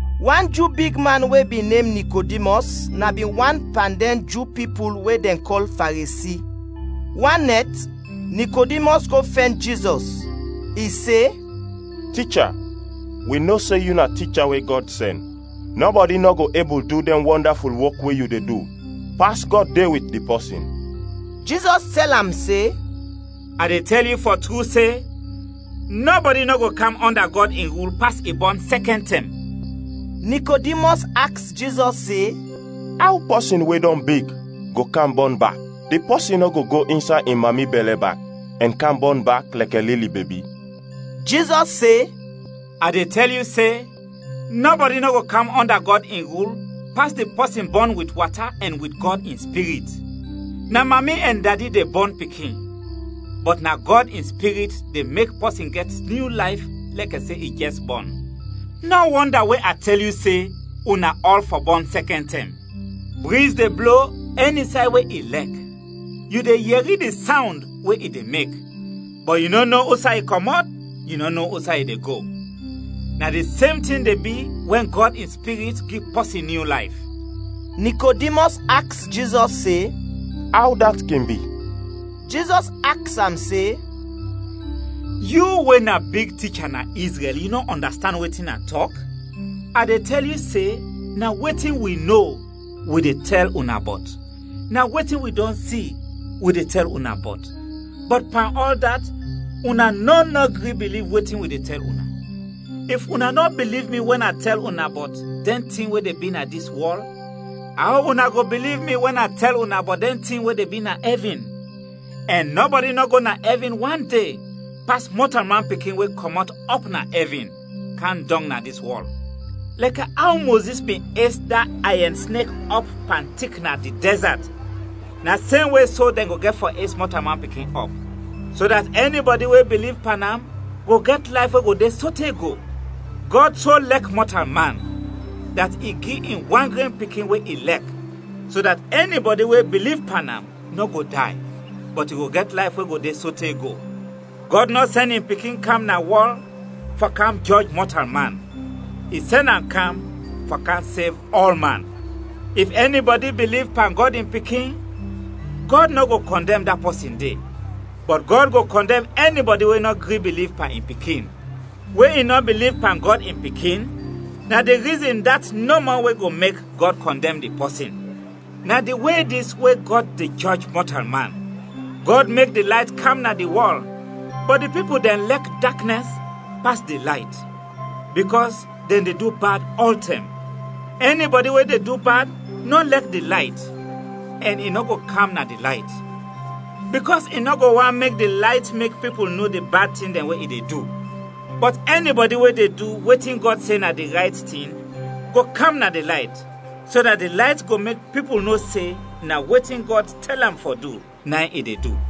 Wan Ju bigman we bin nem Nikodimɔs na bin wan pan dɛn Ju pipul we dɛn kɔl Faresi. Wan nɛt, Nikodimɔs go fɛn Jizɔs. I se, “Ticha, wi no se yu na ticha we Gɔd sɛn. Nɔbɔdi nɔ go ebul du dɛn wɔndaful wok we yu de du, pas Gɔd de wit di pɔsin.” Jizɔs tɛl am se, “A de tɛl yu fɔ tru se, nɔbɔdi nɔ go kam ɔnda Gɔd in rul pas i bɔn sɛkɛn tɛm.” Nikodimɔs aks Jizɔs se, “Aw pɔsin we dɔn big go kam bɔn bak? Di pɔsin nɔ go go insay in mami bɛlɛ bak, ɛn kam bɔn bak lɛkɛ lili bebi!” Jizɔs se, “A de tɛl yu se, nɔbɔdi nɔ go kam ɔnda Gɔd in rul pas di pɔsin bɔn wit wata ɛn wit Gɔd in Spirit. Na mami ɛn dadi de bɔn pikin, bɔt na Gɔd in Spirit de mek pɔsin gɛt nyu layf lɛkɛ se i jɛs bɔn. Nɔ wɔnda we a tɛl yu se, una ɔl fɔ bɔn sɛkɛn tɛm. Briz de blo ɛni say we i lɛk; yu de yɛri di sawnd we i de mek, bɔt yu nɔ no usay i kɔmɔt, yu nɔ no usay i de go. Na di sem tin de bi wɛn Gɔd in Spirit gi pɔsin nyu layf.” Nikodimɔs aks Jizɔs se, “Aw dat kin bi?” Jizɔs aks am se, “Yu we na big ticha na Izrɛl, yu nɔ ɔndastand wetin a tɔk? A de tɛl yu se, na wetin wi no, wi de tɛl una bɔt, na wetin wi dɔn si, wi de tɛl una bɔt, bɔt pan ɔl dat, una nɔn nɔ gri biliv wetin wi de tɛl una. If una nɔ biliv mi wɛn a tɛl una bɔt dɛn tin we de bi na dis wɔl, aw una go biliv mi wɛn a tɛl una bɔt dɛn tin we de bi na ɛvin? Ɛn nɔbɔdi nɔ go na ɛvin wande pas Mɔtalman Pikin we kɔmɔt ɔp na ɛvin, kam dɔng na dis wɔl.” Lɛkɛ aw Mozis bin es da ayɛn snek ɔp pan tik na di dɛzat, na semwe so dɛn go gɛt fɔ es Mɔtalman Pikin ɔp. So dat ɛnibɔdi we biliv pan am go gɛt layf we go de sote go. Gɔd so lɛk mɔtalman dat i gi in wan gren Pikin we i lɛk; so dat ɛnibɔdi we biliv pan am nɔ go day, bɔt i go gɛt layf we go de sote go. Gɔd nɔ sɛn in Pikin kam na wɔl fɔ kam jɔj mɔtalman, i sɛn am kam fɔ kam sev ɔlman. If ɛnibɔdi biliv pan Gɔd in Pikin, Gɔd nɔ go kɔndɛm da pɔsin de. Bɔt Gɔd go kɔndɛm ɛnibɔdi we nɔ gri biliv pan in Pikin; we i nɔ biliv pan Gɔd in Pikin na di rizin dat nɔmɔ we go mek Gɔd kɔndɛm di pɔsin. Na di we dis we Gɔd de jɔj mɔtalman: Gɔd mek di layt kam na di wɔl, bɔt di pipul dɛn lɛk daknɛs pas di layt, bikɔs dɛn de du bad ɔltɛm. Ɛnibɔdi we de du bad, nɔ lɛk di layt ɛn i nɔ go kam na di layt, bikɔs i nɔ go want mek di layt mek pipul no di bad tin dɛn we i de du. Bɔt ɛnibɔdi we de du wetin Gɔd se na di rayt tin go kam na di layt, so dat di layt go mek pipul no se na wetin Gɔd tɛl am fɔ du, na in i de du.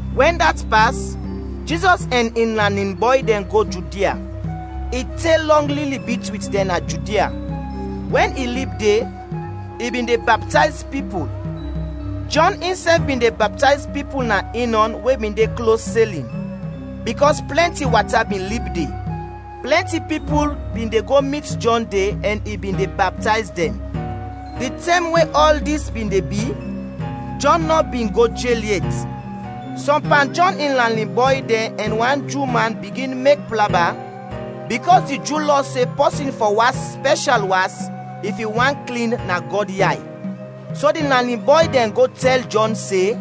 Wɛn dat pas, Jizɔs ɛn in lanin bɔy dɛn go Judia. I te lɔng lili bit wit dɛn na Judia. Wɛn i lib de, i bin de baptayz pipul. Jɔn insɛf bin de baptayz pipul na Inɔn we bin de klos Selin, bikɔs plɛnti wata bin lib de. Plɛnti pipul bin de go mit Jɔn de ɛn i bin de baptayz dɛn. Di tɛm we ɔl dis bin de bi, Jɔn nɔ bin go jel yet. Sɔm pan Jɔn in lanin bɔy dɛn ɛn wan Ju man bigin mek plaba bikɔs di Ju Lɔ se pɔsin fɔ was spɛshal was if i want klin na Gɔd yay. So di lanin bɔy dɛn go tɛl Jɔn se,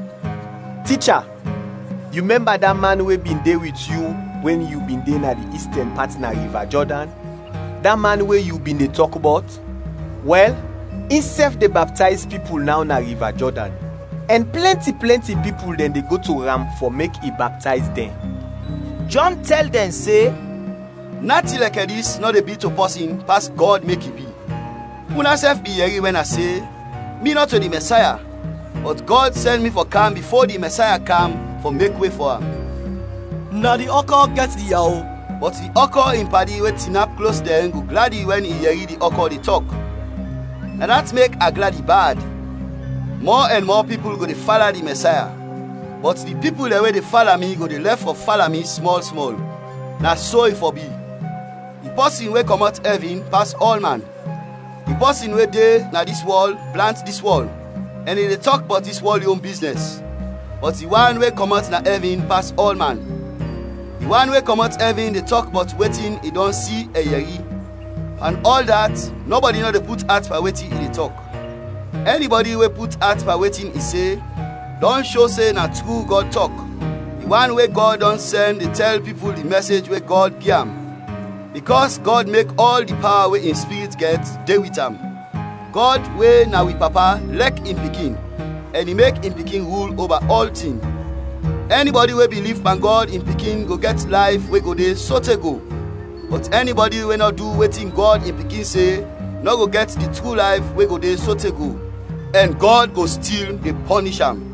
“Ticha, yu mɛmba da man we bin de wit yu wɛn yu bin de na di istɛn pat na Riva Jɔdan, da man we yu bin de tɔk bɔt? Wɛl, insɛf de baptayz pipul naw na Riva Jɔdan, ɛn plɛnti plɛnti pipul de go to am fɔ mek i baptayz dɛn!” Jɔn tɛl dɛn se, “Natin lɛkɛ dis nɔ de bi to pɔsin pas Gɔd mek i bi. Unasɛf bin yɛri wɛn a se, ‘Mi nɔto di Mɛsaya, bɔt Gɔd sɛn mi fɔ kam bifo di Mɛsaya kam fɔ mek we fɔ am.’ Na di ɔkɔ gɛt di yawo, bɔt di ɔkɔ in padi we tinap klos dɛn go gladi wɛn i yɛri di ɔkɔ de tɔk. Na dat mek a gladi bad. Mɔ ɛn mɔ pipul go de fala di Mɛsaya, bɔt di pipul dɛn we de fala mi go de lɛf fɔ fala mi smɔl smɔl. Na so i fɔ bi.” Di pɔsin we kɔmɔt ɛvin, pas ɔlman. Di pɔsin we de na dis wɔl blant dis wɔl, ɛn i de tɔk bɔt dis wɔl yon biznɛs, bɔt di wan we kɔmɔt na ɛvin pas ɔlman. Di wan we kɔmɔt ɛvin de tɔk bɔt wetin i dɔn si ɛn yɛri; pan ɔl dat nɔbɔdi nɔ de put at pan wetin i de tɔk. Ɛnibɔdi we put at pan wetin i se, dɔn sho se na tru Gɔd tɔk. Di wan we Gɔd dɔn sɛn de tɛl pipul di mɛsej we Gɔd gi am, bikɔs Gɔd mek ɔl di pawa we in Spirit gɛt de wit am. Gɔd we na wi Papa lɛk in Pikin ɛn i mek in Pikin rul oba ɔltin. Ɛnibɔdi we biliv pan Gɔd in Pikin go gɛt layf we go de sote go; bɔt ɛnibɔdi we nɔ du wetin Gɔd in Pikin se, nɔ go gɛt di tru layf we de sote go, ɛn Gɔd go stil de pɔnish am.